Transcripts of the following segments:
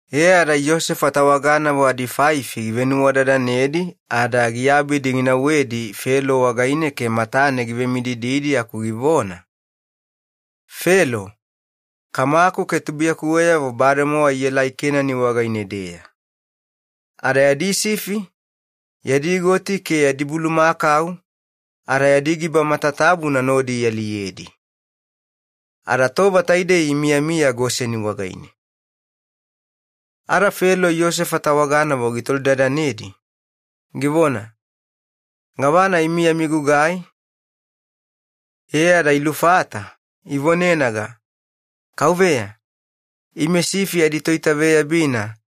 E ada Yosefa tawaganavo adinimafafalina givenuwadadanedi ada giabidi ginauwedi Felo wagaine ke matane givemidididi aku givona, “Felo, kamaku ke akutubulugayavo bademowa ielai Kenani wagaine-deya. Ada yadi sifi, yadi goti ke yadi bulumakau ada yadi giba matatabuna nodi ialiyedi, ada tova taidei imiyamiya Goseni wagaine.” Ada Felo Yosefa tawaganavo gitolidadanedi, givona, “Gavana imi yami gugai?” E ada ilufata, ivonenaga, “Kauveya, ime toitaveyabina sifi,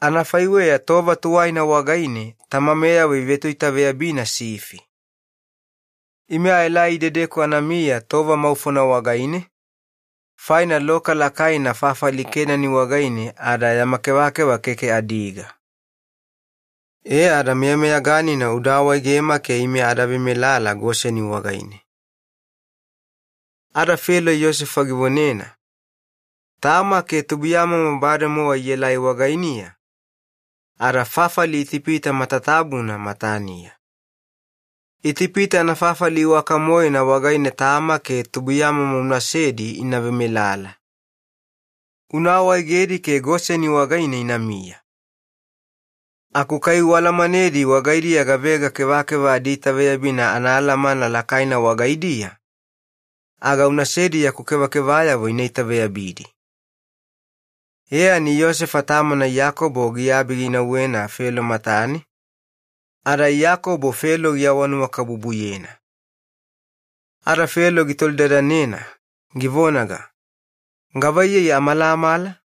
anafaiweya tova tuwaina wagaine tamameyavo ivetoitaveyabina sifi.” Ada kaduwe ivone-vagilena, “Ime aelai idedeku anamiya tova maufona wagaine, faina loka lakaina fafali Kenani wagaine ada yama kevakeva keke adiga. Taidei faina meyameyaganina uda awaegema adavemelala Goseni wagaine.” Ada Felo Yosefa givonena, “Tama ke atubulugamomo bademowa ielai wagainiya, ada fafali Itipita matatabuna mataniya. Itipita anafafali iwakana wagaine tama ke atubulugamomo unasedi ina vemelala. Una awaegedi ke Goseni wagaine inamiya. Aku kai ualamanedi wagaidiya gavega kevakeva adiitaveyabina anaalamana lakaina wagaidiya aga unasedi yaku kevakevayavo ina itaveyabidi.” Muliya kaduwe Yosefa tamana Iyakobo giabi ginauwena Felo matane. Ada Iyakobo Felo givesiuleyena muline, Felo gitolidadanena, givonaga, “Gavaiyei amalamala?”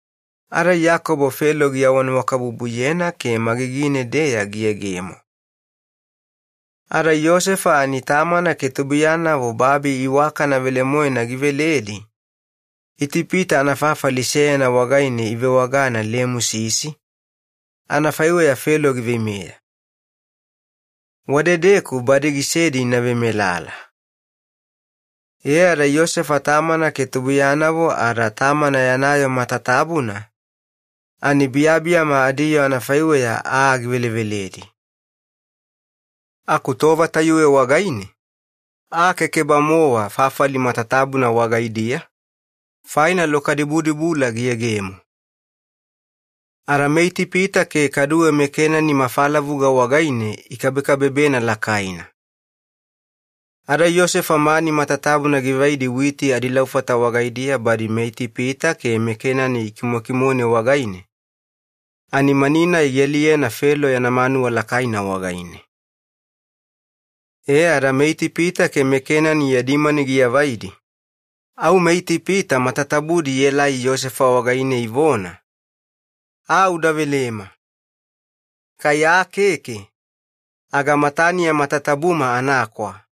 Ada Iyakobo Felo giawanuwakabubuyena ke magigine-deya giyegemo. Ada Yosefa ani tamana ke anatubulugayavo babi iwakana velemoena giveledi Itipita anafafali seyana wagaine ivewagana Lemusisi, anafaiweya Felo giveimeya. Wadedeku badi gisedi ina vemelala. E ada Yosefa tamana ke anatubulugayavo ada tamana yana yoo matatabuna, kaduwe biyabiyama adiyoo anafaiweya aa giveleveledi. Yosefa ada loka-nai. Aku tova tayuwe wagaine aa keke-bamowa fafali matatabuna wagaidiya, faina loka dubudubula giyegemo. Ada Itipita ke kaduwe Kenani ikabekabebena lakaina faina loka. Ada Yosefa mani matatabuna givaidi witi adilaufata wagaidiya badi meItipita ke meKenani ikimokimone wagaine, ani mani-nai gialiyena Felo yana manuwa lakaina wagaine. E ada meItipita ke meKenani yadi mani giavaidi, au meItipita matatabudi ielai Yosefa wagaine ivona, “Aa uda velema, yama mani bademowa aluyabudi. Aku kai aa keke aga mataniya matatabuma anakwa.”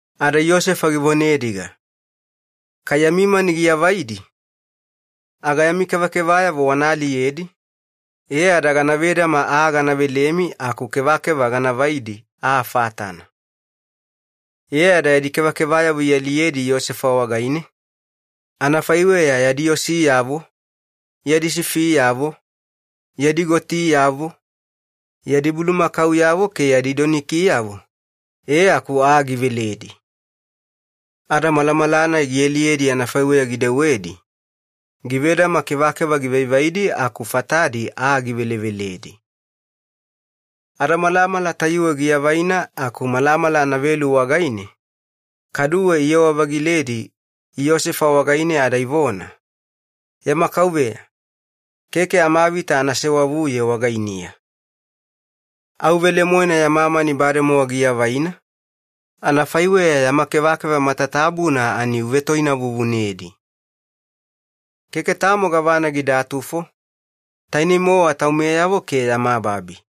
Ada Yosefa givonediga, “Kai yami mani giavaidi, aga yami kevakevayavo wana aliyedi, e ada gana vedama aa gana velemi aku kevakeva ganavaidi aa fatana.” E ada yadi kevakevayavo ialiyedi Yosefa wagaine, anafaiweya yadi osiyavo, yadi sifiyavo, yadi gotiyavo, yadi bulumakauyavo ke yadi donikiyavo, e aku aa giveledi. Ada malamala-nai gialiyedi anafaiweya gidewedi givedama kevakeva givaivaidi aku fatadi aa giveleveledi. Ada malamala tayuwe giavaina aku malamala anavelu wagaine kaduwe iyewa-vagiledi Yosefa wagaine ada ivona, “Yama kauveya, keke amavita ana sewavuye wagainiya, au velemoena yama mani bademowa giavaina, anafaiweya yama kevakeva matatabuna oyeni gagana, ada keke tamo gavana gidatufo, tainei-mowa taumeyavo ke yama babi.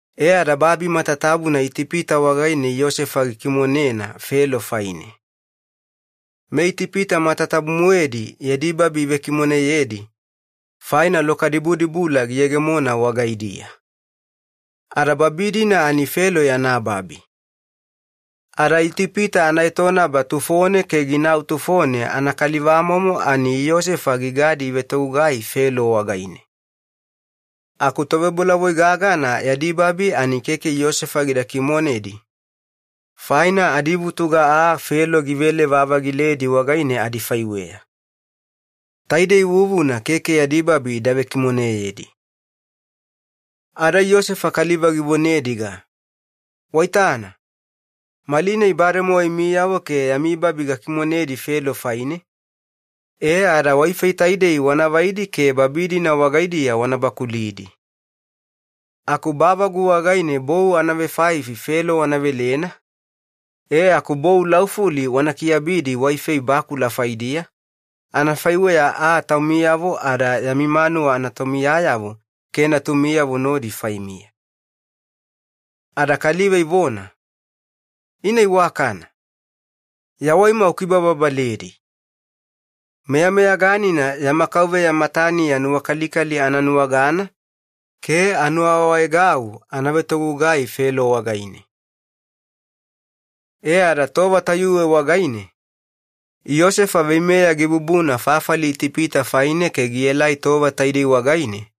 E ada babi matatabuna Itipita wagaine Yosefa gikimonena Felo faine. MeItipita matatabu-moedi yadi babi ivekimoneyedi, faina loka dubudubula giyegemona wagaidiya. Ada babi-dina Felo yana babi, ada Itipita anaetonaba tufone ke ginau tufone anakalivamomo ani Yosefa gigadi ivetogugai yogoyogona Felo wagaine. Aku tovebolavoiyavo gagana yadi babi ani keke Yosefa gida kimonedi, faina adivutuga aa Felo givele-vavagiledi wagaine adifaiweya. Taidei vuvuna keke yadi babi ida vekimoneyedi. Ada Yosefa kaliva givonediga, “Waitana, malinai bademowa imiyavo ke yami babi gakimonedi Felo faine, e ada waifei taidei wanavaidi ke babi-dina wagaidiya wana bakulidi. Aku bavagu wagaine bou anavenimafafalina Felo wana velena, e aku bou laufuli wana kiyabidi waifei bakula faidiya, anafaiweya aa taumiyavo ada yami manuwa anatomiyanavo ke natumiyavo nodi faimiya.” Ada kaliva ivona, “Ina iwakana! Yawaima ukibababaledi! Meyameyaganina yama kauveya mataniya nuwakalikali ananuwagana ke anuwaawaegau ana vetogugai yogoyogona Felo wagaine.” Ada tova tayuwe wagaine Yosefa veimeya gibubuna fafali Itipita faine ke gielai tova taidei wagaine,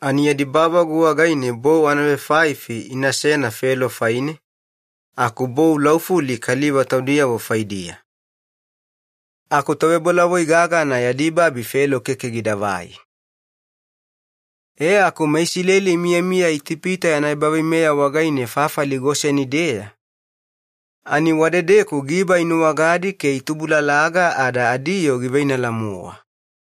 ina bavagu wagaine bou anavenimafafalina Felo faine, aku bou laufuli kaliva taudiyavo faidiya. Aku tovebolavoi gagana yadi babi Felo keke gidavai. E aku meIsileli imiyamiya Itipita yana ebaveimeya wagaine fafali Goseni-deya, ani wadedeku giba inuwagadi ke itubulalaga ada adiyoo giveinala-mowa.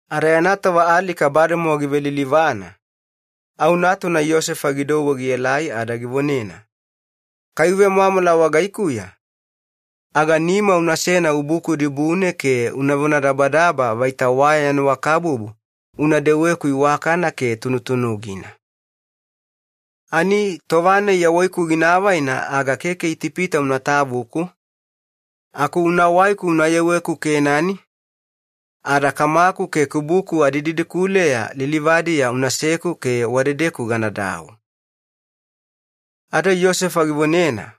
Ada yana tova alika bademowa givelilivane, au natuna Yosefa gidouwe gielai ada givonena, “Kai uvemwamwala wagaikuya aga nima unasena ubuku dibune ke una vonadabadaba vaita una vewaleku nuwakalikali ke dewa tunutunugina. Ani, tova-nai yawaiku gina avaina aga keke Itipita una tavuku. Keke idedeku-deya unatavuku, e aku unawaiku unayeweku Kenani, ada kamaku ke kubuku adididikuleya lilivadiya unaseku ke wadedeku ganadau.” Ada Yosefa givonena,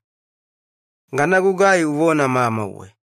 “Ganagugai uvona mamauwe.”